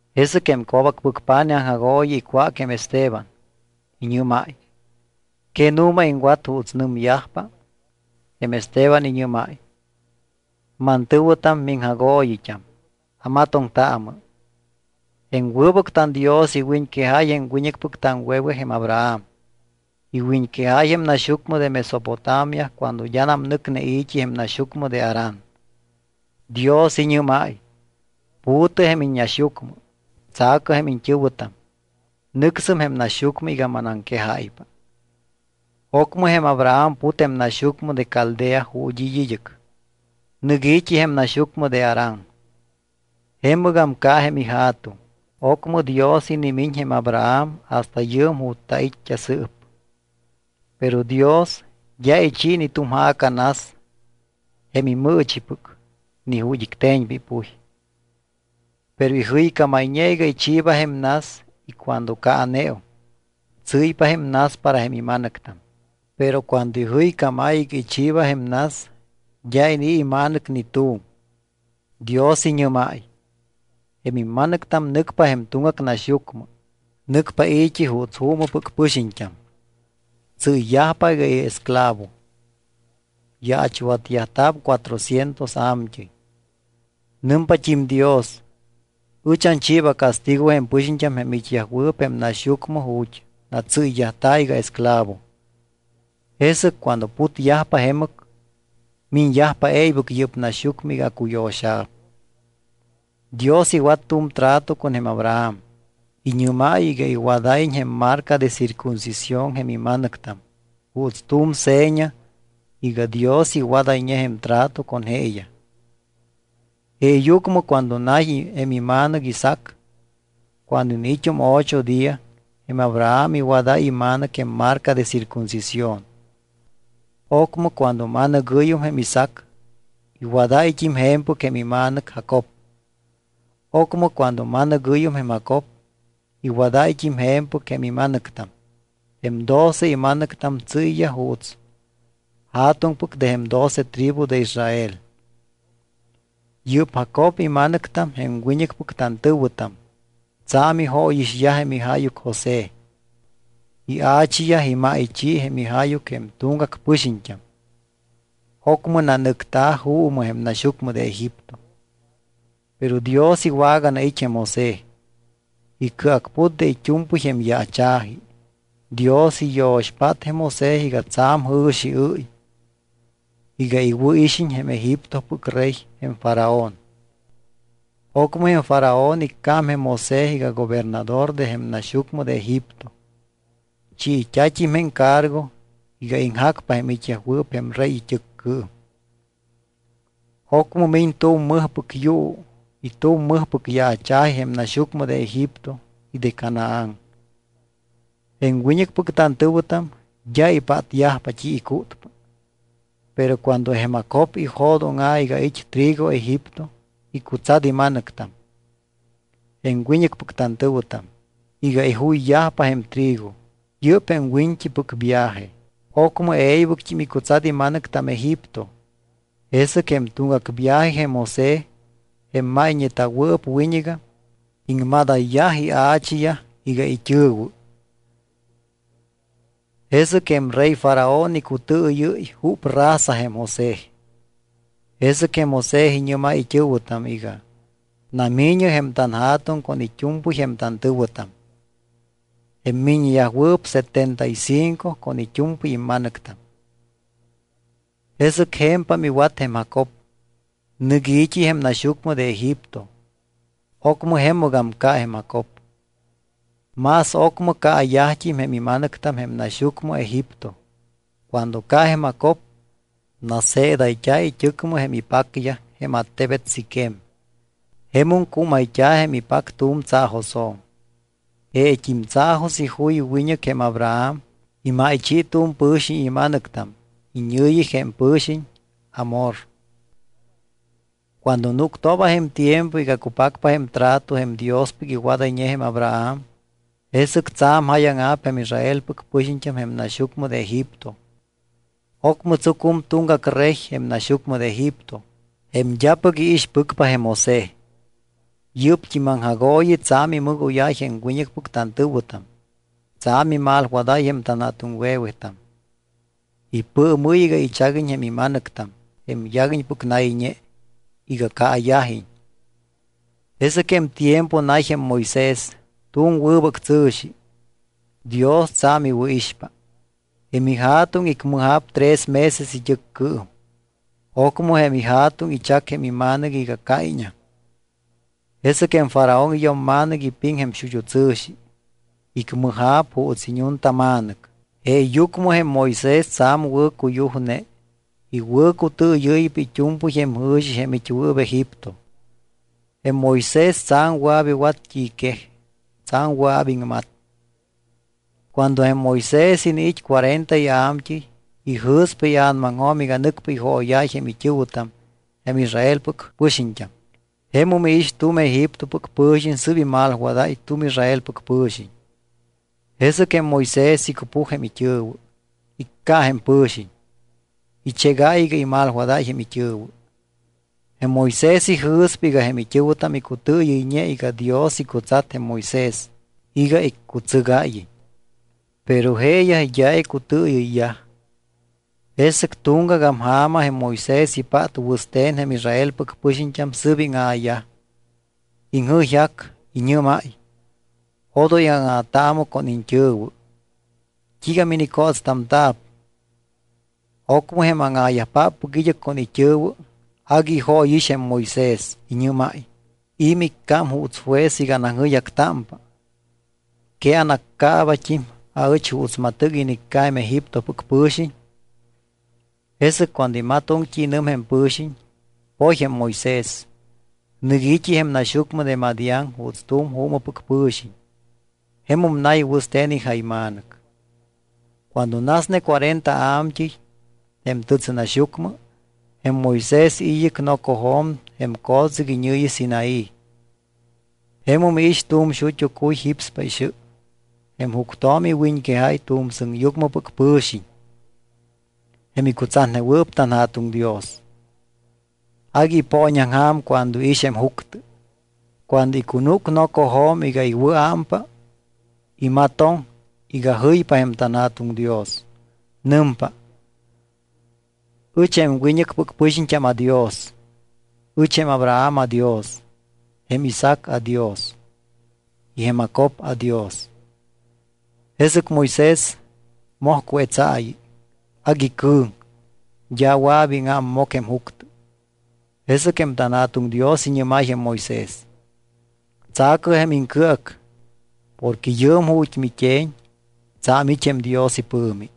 Jesɨc jém co̱bacpɨc pa̱nij aŋjagooyi icwác jém Esteban. Iñɨ́máy: —¿Que nu̱ma iŋwat juuts nɨmyajpa? Jém Esteban iñɨ́máy: —Mantɨ̱wɨtam, miŋjagooyit́am, amatoŋtaamɨ. Jém wɨbɨc tanDios iwiñquejáy jém wiñɨcpɨc taŋwe̱we jém Abraham. Iwiñquejáy jém naxyucmɨ de Mesopotamia cuando d́anam nɨcne i̱t́i jém naxyucmɨ de Harán. Dios iñɨ́máy: “Pu̱tɨ jém iññaxyucmɨ. Tsa̱cɨ jém iñt́ɨ̱wɨtam. Nɨcsɨm jém naxyucmɨ iga manaŋquejáypa.” Ocmɨ jém Abraham put jém naxyucmɨ de Caldea ju̱t́ it́ id́ɨc. Nɨc i̱t́i jém naxyucmɨ de Harán. Jemɨgam ca jém ija̱tuŋ. Ocmɨ Dios inimiñ jém Abraham hasta yɨɨm ju̱t́ tait́t́a sɨɨp. Pero Dios d́a ichi ni tu̱m ja̱ca nas jém imɨɨchipɨc ni ju̱t́ icte̱ñpa ipuy. Pero ijɨycámayñe iga ichiiba jém nas y cuando caaneum, tsɨ́ypa jém nas para jém ima̱nɨctam. Pero cuando ijɨycámáy iga ichiiba jém nas d́a inii̱ ima̱nɨc ni tu̱m. Dios iñɨ́máy: “Jém imma̱nɨctam nɨcpa jém tuŋgac naxyucmɨ. Nɨcpa i̱t́i juuts juumɨpɨc pɨxiñt́am. Tsɨ́yyajpa iga esclavo, yaachwatyajta̱p cuatrocientos a̱mt́ɨy.” Nɨmpat́im Dios: “Ɨch anchiiba castigo jém pɨxiñt́am jém it́yajwɨɨp jém naxyucmɨ ju̱t́ natsɨ́yyajta̱ iga esclavo. Jesɨc cuando putyajpa jemɨc, miñyajpa e̱ybɨc yɨ́p naxyucmɨ iga acuyo̱xa̱p.” Dios iwat tu̱m trato con jém Abraham. Iñɨ́máy iga iwadáyiñ jém marca de circuncisión jém ima̱nɨctam juuts tu̱m seña iga Dios iwadayñe jém trato con jeeyaj. Jeeyucmɨ cuando nay jém ima̱nɨc Isaac, cuando iniit́um ocho día, jém Abraham iwadáy ima̱nɨc jém marca de circuncisión. Ocmɨ cuando ma̱nɨgɨ́yum jém Isaac, iwadáyt́im je̱mpɨc jém ima̱nɨc Jacob. Ocmɨ cuando ma̱nɨgɨ́yum jém Jacob iwadáyt́im je̱mpɨc jém ima̱nɨctam. Jém doce ima̱nɨctam tsɨ́yyaj juuts ja̱tuŋpɨc de jém doce tribu de Israel. ’Yɨ́p Jacob ima̱nɨctam jém wiñɨcpɨc tantɨ̱wɨtam tsa̱m ijóyixyaj jém ijáyuc José. Ia̱chiyaj imáychi jém ijáyuc jém tuŋgac pɨxiñt́am. Ocmɨ nanɨcta̱ juumɨ jém naxyucmɨ de Egipto. Pero Dios iwaganait́ jém José. Icɨacput de it́u̱mpɨy jém yaacha̱ji. Dios iyo̱xpát jém José iga tsa̱m jɨ̱xiɨ́y iga iwɨ̱ixiñ jém Egiptopɨc rey jém Faraón. Ocmɨ jém Faraón iccám jém José iga gobernador de jém naxyucmɨ de Egipto. Chiit́a̱t́im jém cargo iga iŋjacpa jém it́yajwɨɨp jém rey it́ɨccɨɨm. ’Ocmɨ miñ tu̱m mɨjpɨc yuu y tu̱m mɨjpɨc yaacha̱ji jém naxyucmɨ de Egipto y jém Canaán. Jém wiñɨcpɨc tantɨ̱wɨtam d́a ipátyajpa t́i icútpa. Pero cuando jém Jacob ijo̱dóŋa̱ iga it́ trigo Egipto icutsat ima̱nɨctam, jém wiñɨcpɨc tantɨ̱wɨtam, iga ijuyyajpa jém trigo. Yɨ́p jém wiñt́ipɨc viaje. Ocmɨ e̱ybɨct́im icutsat ima̱nɨctam Egipto. Jesɨc jém tuŋgac viaje jém José, jém máyñeta̱wɨɨp wiñɨgam, iŋmadayyaj ia̱chiyaj iga it́ɨ̱wɨ. Jesɨc jém rey Faraón icutɨɨyɨ́y júp raza jém José. Jesɨc José iñɨ́máy it́ɨ̱wɨtam iga: “Nami̱ñɨ jém tanja̱tuŋ con it́u̱mpɨy jém tantɨ̱wɨtam.” Jém miññeyajwɨɨp setenta y cinco con it́u̱mpɨy ima̱nɨctam. Jesɨc je̱mpam iwat jém Jacob. Nɨc i̱t́i jém naxyucmɨ de Egipto. Ocmɨ jemɨgam ca jém Jacob. Más ocmɨ caayajt́im jém ima̱nɨctam jém naxyucmɨ Egipto. Cuando ca jém Jacob, naseedayt́a̱ it́ɨcmɨ jém ipacyaj jém attebet Siquem. Jemum cúmayt́a̱ jém ipac tu̱m tsaajosjo̱m. Jeet́im tsaajos ijuy wiñɨc jém Abraham. Imáychi tu̱m pɨ̱xiñ ima̱nɨctam, iñɨ̱yi jém pɨ̱xiñ Hamor. ’Cuando núctooba jém tiempo iga cupacpa jém trato jém Diospɨc iwadayñe jém Abraham, jesɨc tsa̱m jáyaŋa̱p jém Israelpɨc pɨxiñt́am jém naxyucmɨ de Egipto. Ocmɨ tsucum tuŋgac rey jém naxyucmɨ de Egipto jém d́apɨc iixpɨcpa jém José. Yɨ́p aŋjagooyi tsa̱m imɨgóyáy jém wiñɨcpɨc tantɨ̱wɨtam. Tsa̱m imalwadáy jém tanja̱tuŋwe̱wetam. Ipɨɨmɨ́y iga ichaguiñ jém ima̱nɨctam, jém yaguiñpɨc nayñe, iga caayajiñ. Jesɨc jém tiempo nay jém Moisés, tu̱m wɨbɨc tsɨ̱xi, Dios tsa̱m iwɨ̱ixpa. Jém ija̱tuŋ icmɨja̱p tres meses it́ɨccɨɨm. Ocmɨ jém ija̱tuŋ ichac jém ima̱nɨc iga caiññam. Jesɨc jém Faraón iyo̱mma̱nɨc ipiŋ jém xut́u tsɨ̱xi. Icmɨja̱p juuts iñuntama̱nɨc. Jeeyucmɨ jém Moisés tsa̱m wɨ̱cuyujne. Iwɨ̱cutɨɨyɨ́ypa it́u̱mpɨy jém jɨ̱xi jém it́wɨɨp Egipto. Jém Moisés tsa̱m wɨa̱p iwat t́i quej. Tsa̱m wɨa̱p iŋmat. ’Cuando jém Moisés iniit́ cuarenta ia̱mt́ɨy, ijɨ̱spa ia̱namaŋjo̱m iga nɨcpa ijooyáy jém it́ɨ̱wɨtam jém Israelpɨc pɨxiñt́am. Jemum iix tu̱m Egiptopɨc pɨ̱xiñ sɨ́p imalwadáy tu̱m Israelpɨc pɨ̱xiñ. Jesɨc jém Moisés icupuj jém it́ɨ̱wɨ. Icca jém pɨ̱xiñ, ichégáy iga imalwadáy jém it́ɨ̱wɨ. Jém Moisés ijɨ̱spa iga jém it́ɨ̱wɨtam icutɨɨyɨyñe iga Dios icutsat jém Moisés iga iccutsɨgáyiñ. Pero jeeyaj d́a icutɨɨyɨyyaj. Jesɨc tuŋgagam ja̱ma jém Moisés ipát wɨste̱n jém Israelpɨc pɨxiñt́am sɨ́p íŋa̱yaj. Iŋjɨyjac. Iñɨ́máy: “Odoy áŋa̱taamɨ con iñt́ɨ̱wɨ. ¿T́iiga minicótstamta̱p?” Ocmɨ jém áŋa̱yajpáppɨc id́ɨc con it́ɨ̱wɨ agui ijóyix jém Moisés. Iñɨ́máy: “¿I̱ miccám juuts juez iga anaŋjɨyjactámpa? ¿Que anaccaabat́im aɨch juuts matɨc inicca jém Egiptopɨc pɨ̱xiñ?” Jesɨc cuando imatoŋ t́i nɨm jém pɨ̱xiñ, poy jém Moisés. Nɨc i̱t́i jém naxyucmɨ de Madián juuts tu̱m juumɨpɨc pɨ̱xiñ. Jemum nay wɨste̱n ijayma̱nɨc. ’Cuando nasne cuarenta a̱mt́ɨy jém tɨtsɨnaxyucmɨ, jém Moisés it́ id́ɨc nocojo̱m jém co̱tsɨc iñɨ̱yi Sinaí. Jemum iix tu̱m xut́u cuy jípspa ixɨ. Jém juctjo̱m iwiñquejáy tu̱m sɨŋyucmɨpɨc pɨ̱xiñ, jém icutsatnewɨɨp tanJa̱tuŋ Dios. Agui ipooñaŋja̱m cuando iix jém juctɨ. Cuando icunúc nocojo̱m iga iwɨ̱ámpa, imatoŋ iga jɨypa jém tanJa̱tuŋ Dios. Nɨmpa: “Ɨch jém wiñɨcpɨc pɨxiñt́am aDios. Ɨch jém Abraham aDios, jém Isaac aDios y jém Jacob aDios.” Jesɨc Moisés moj cuetsaayi. Agui cɨ̱ŋ, d́a wɨa̱p íŋámmoc jém juctɨ. Jesɨc jém tanJa̱tuŋ Dios iñɨ́máy jém Moisés: “Tsa̱cɨ jém iŋcɨac porque yɨɨm ju̱t́ mit́e̱ñ tsa̱m it́ jém Dios ipɨ̱mi.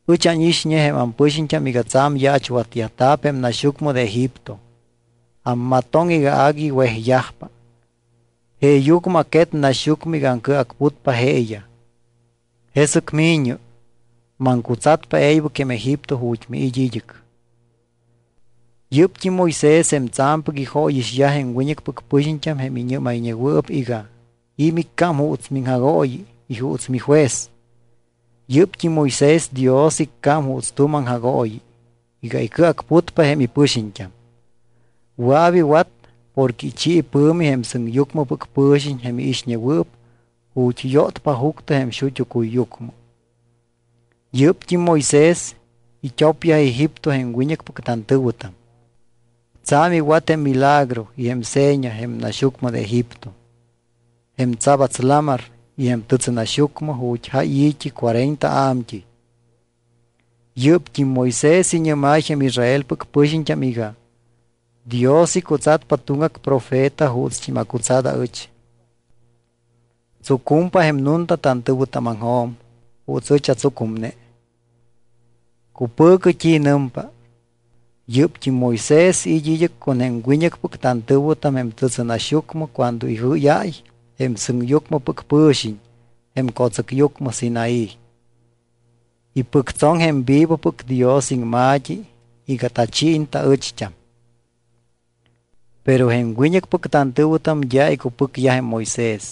Ɨch ánixñe jém ampɨxiñt́am iga tsa̱m yaachwatyajta̱p jém naxyucmɨ de Egipto. Ammatoŋ iga agui wejyajpa. Jeeyucmɨ aquet naxyucmɨ iga aŋcɨacputpa jeeyaj. Jesɨc mi̱ñɨ, maŋcutsatpa e̱ybɨc jém Egipto ju̱t́ miit́ id́ɨc.” ’Yɨ́pt́im Moisés jém tsa̱mpɨc ijóyixyaj jém wiñɨcpɨc pɨxiñt́am jém iñɨ́mayñewɨɨp iga: “¿I̱ miccám juuts miŋjagooyi y juuts mijuez?” Yɨ́pt́im Moisés Dios iccám juuts tu̱m aŋjagooyi iga icɨacputpa jém ipɨxiñt́am. Wɨa̱p iwat porque ichi ipɨ̱mi jém sɨŋyucmɨpɨc pɨ̱xiñ jém iixñewɨɨp ju̱t́ yótpa juctɨ jém xut́u cuyyucmɨ. Yɨ́pt́im Moisés it́opyaj Egipto jém wiñɨcpɨc tantɨ̱wɨtam. Tsa̱m iwat jém milagro y jém seña jém naxyucmɨ de Egipto, jém Tsabats Lamar y jém tɨtsɨnaxyucmɨ ju̱t́ jáy i̱t́i cuarenta a̱mt́ɨy. Yɨ́pt́im Moisés iñɨ́máy jém Israelpɨc pɨxiñt́am iga: “Dios icutsatpa tuŋgac profeta juutst́im acutsat aɨch. Tsucumpa jém nunta tantɨ̱wɨtámaŋjo̱m juuts ɨch atsucumne. Cupɨ̱cɨ t́i nɨmpa.” Yɨ́pt́im Moisés it́ id́ɨc con jém wiñɨcpɨc tantɨ̱wɨtam jém tɨtsɨnaxyucmɨ cuando ijɨ́yáy jém sɨŋyucmɨ pɨ̱xiñ jém co̱tsɨcyucmɨ Sinaí. Ipɨctsoŋ jém vivopɨc Dios iŋma̱t́i iga tachiiñ taɨcht́am. ’Pero jém wiñɨcpɨc tantɨ̱wɨtam d́a icupɨcyaj jém Moisés.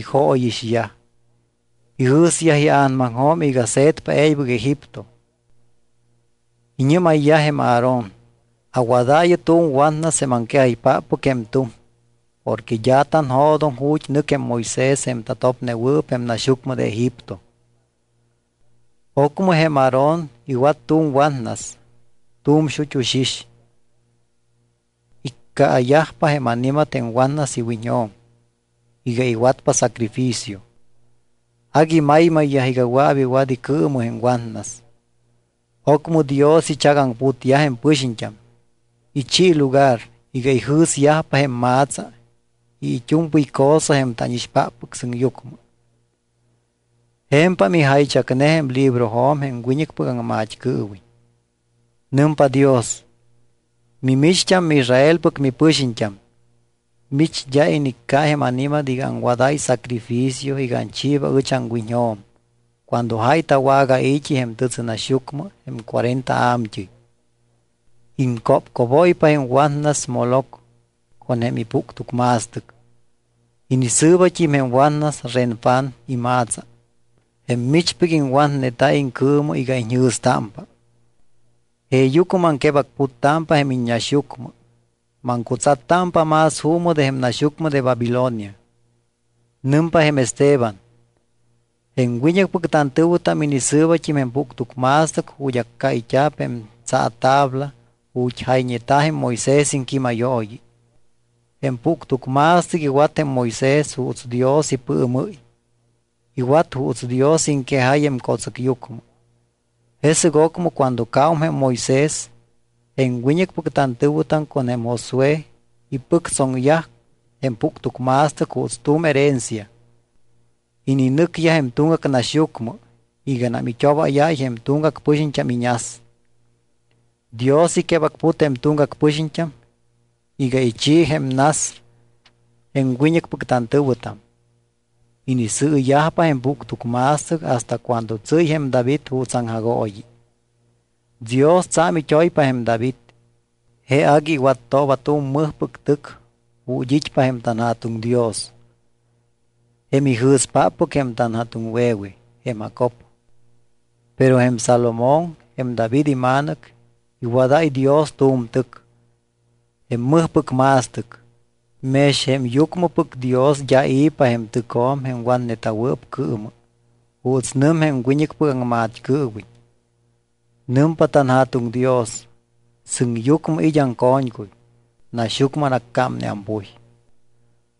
Ijóyixyaj. Ijɨ̱syaj ia̱namaŋjo̱m iga se̱tpa e̱ybɨc Egipto. Iñɨ́mayyaj jém Aarón: “Awadaayɨ tu̱m watnas jém aŋquejaypáppɨc jém tuŋ porque d́a tanjo̱doŋ ju̱t́ nɨc jém Moisés jém tatopnewɨɨp jém naxyucmɨ de Egipto.” Ocmɨ jém Aarón iwat tu̱m watnas, tu̱m xut́u xix. Iccaayajpa jém ani̱mat jém watnas iwiñjo̱m iga iwatpa sacrificio. Agui maymayyaj iga wɨa̱p iwat icɨɨmɨ jém watnas. Ocmɨ Dios ichagaŋputyaj jém pɨxiñt́am. Ichi lugar iga ijɨ̱syajpa jém ma̱tsa y it́u̱mpɨy cosa jém tánixpáppɨc sɨŋyucmɨ. Je̱mpam ijaychacne jém librojo̱m jém wiñɨcpɨc aŋmat́cɨɨwiñ. Nɨmpa Dios: Mimicht́am miIsraelpɨc mipɨxiñt́am, mich d́a inicca jém ani̱mat iga aŋwadáy sacrificio iga anchiiba ɨch aŋwiñjo̱m cuando jáy tawagai̱t́i jém tɨtsɨnaxyucmɨ jém cuarenta a̱mt́ɨy. Iŋcópcóbóypa jém watnas Moloc con jém ipuctucma̱stɨc. Inisɨɨbat́im jém watnas Renfán ima̱tsa jém michpɨc iŋwatneta iŋcɨɨmɨ iga iñjɨ̱stámpa. Jeeyucmɨ maŋquebacputtámpa jém iññaxyucmɨ. Maŋcutsattámpa más juumɨ de jém naxyucmɨ de Babilonia. Nɨmpa jém Esteban: —Jém wiñɨcpɨc tantɨ̱wɨtam inisɨɨbat́im jém puctucma̱stɨc ju̱t́ accáyt́a̱p jém tsaatabla ju̱t́ jayñeta̱ jém Moisés iŋquímayooyi. Jém puctucma̱stɨc iwat jém Moisés juuts Dios ipɨɨmɨ́y. Iwat juuts Dios iŋquejáy jém co̱tsɨcyucmɨ. Jesɨc ocmɨ cuando caum jém Moisés, jém wiñɨcpɨc tantɨ̱wɨtam con jém Josué ipɨctsoŋyaj jém puctucma̱stɨc juuts tu̱m herencia. Ininɨcyaj jém tuŋgac naxyucmɨ iganam it́obáyáy jém tuŋgac pɨxiñt́am iñas. Dios iquebacput jém tuŋgac pɨxiñt́am iga ichi jém nas jém wiñɨcpɨc tantɨ̱wɨtam. Inisɨɨyajpa jém puctucma̱stɨc hasta cuando tsɨ́y jém David juuts aŋjagooyi. Dios tsa̱m it́oypa jém David. Je agui iwattooba tu̱m mɨjpɨc tɨc ju̱t́ it́pa jém tanJa̱tuŋ Dios, jém ijɨ̱spáppɨc jém tanja̱tuŋwe̱we jém Jacob. Pero jém Salomón, jém David ima̱nɨc, iwadáy Dios tu̱m tɨc, jém mɨjpɨc ma̱stɨc. Mex jém yucmɨpɨc Dios d́a i̱pa jém tɨcjo̱m jém watneta̱wɨɨp cɨɨmɨ, juuts nɨm jém wiñɨcpɨc aŋmat́cɨɨwiñ: Nɨmpa tanJa̱tuŋ Dios: Sɨŋyucmɨ it́ aŋco̱ñcuy. Naxyucmɨ anaccámne ampuy.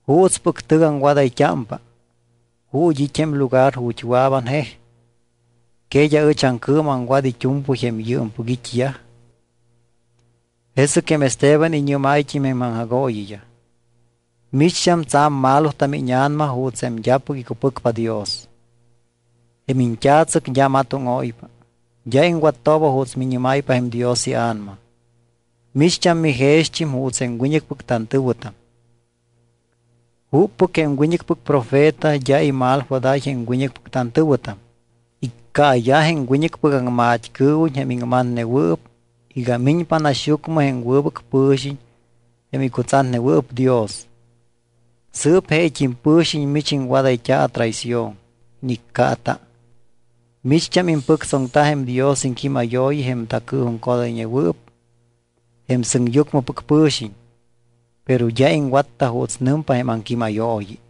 ¿Juutspɨc tɨc aŋwadayt́ámpa? ¿Ju̱t́ it́ jém lugar ju̱t́ wɨa̱p anjej? ¿Que d́a ɨch aŋcɨɨmɨ aŋwat it́u̱mpɨy jém yɨɨmpɨc it́yaj? Jesɨc jém Esteban iñɨ́máyt́im jém aŋjagooyiyaj: —Micht́am tsa̱m malotam íña̱nama juuts jém d́apɨc icupɨcpa Dios. Jém iñt́a̱tsɨc d́a matóŋóypa, d́a iŋwattooba juuts miñɨ́máypa jém Dios iA̱nama. Micht́am mijext́im juuts jém wiñɨcpɨc tantɨ̱wɨtam. ¿Juppɨc jém wiñɨcpɨc profeta d́a imalwadáy jém wiñɨcpɨc tantɨ̱wɨtam? Iccaayaj jém wiñɨcpɨc aŋmat́cɨɨwiñ jém iŋmatnewɨɨp iga miñpa naxyucmɨ jém Wɨbɨc Pɨ̱xiñ jém icutsatnewɨɨp Dios. Sɨɨp jeet́im pɨ̱xiñ mich iŋwadayt́a atraición. Iniccaata. Micht́am impɨctsoŋta jém Dios iŋquímayooyi jém tacɨɨjuŋcodayñewɨɨp jém sɨŋyucmɨpɨc pɨ̱xiñ, pero d́a iŋwatta juuts nɨmpa jém aŋquímayooyi.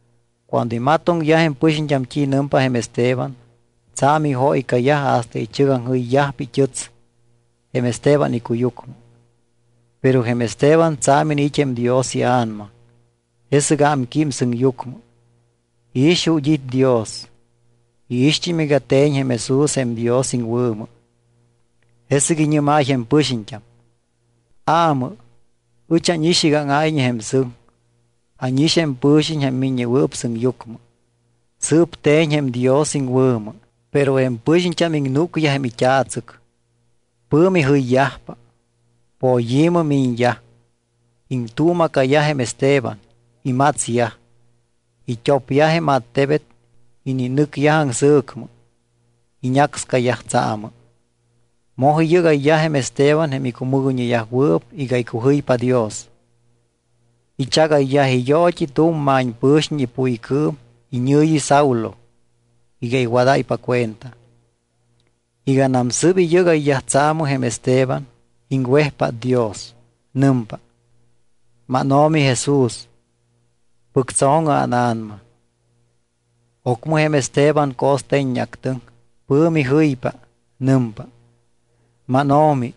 Cuando imatoŋyaj jém pɨxiñt́am t́i nɨmpa jém Esteban, tsa̱m ijóycayaj hasta ichɨgaŋjɨyyajpa it́ɨts jém Esteban icuyucmɨ. Pero jém Esteban tsa̱m iniit́ jém Dios iA̱nama. Jesɨc ámquím sɨŋyucmɨ, iix ju̱t́ it́ Dios. Iixt́im iga te̱ñ jém Jesús jém Dios iŋwɨ̱mɨ. Jesɨc iñɨ́máy jém pɨxiñt́am: —Aamɨ. Ɨch ánix iga áŋáyñe jém sɨŋ. Ánix jém Pɨ̱xiñ jém Miññewɨɨp Sɨŋyucmɨ. Sɨɨp te̱ñ jém Dios iŋwɨ̱mɨ. Pero jém pɨxiñt́am iŋnúcyaj jém it́a̱tsɨc. Pɨ̱mi jɨyyajpa, poyi̱mɨ miñyaj, iŋtuuma̱cayaj jém Esteban. Imatsyaj. It́opyaj jém attebet, ininɨcyaj aŋsɨ̱cmɨ. Iñácscayaj tsaamɨ. Moj iyɨ́gayyaj jém Esteban jém icumɨgoyñeyajwɨɨp iga icujɨypa Dios. Ichagayyaj iyoot́i tu̱m ma̱ñpɨ̱xiñ ipuycɨɨm, iñɨ̱yi Saulo, iga iwadáypa cuenta. Iganam sɨ́p iyɨ́gayyaj tsaamɨ jém Esteban, iŋwejpát Dios. Nɨmpa: —MánO̱mi Jesús, pɨctso̱ŋɨ ána̱nama. Ocmɨ jém Esteban co̱ste̱ññeactɨŋ. Pɨ̱mi jɨypa. Nɨmpa: —MánO̱mi,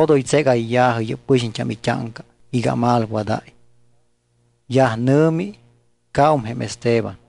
odoy tségayya̱jɨ yɨ́p pɨxiñt́am it́áŋca iga amalwadáy. Yaj nɨ̱mi, caum jém Esteban.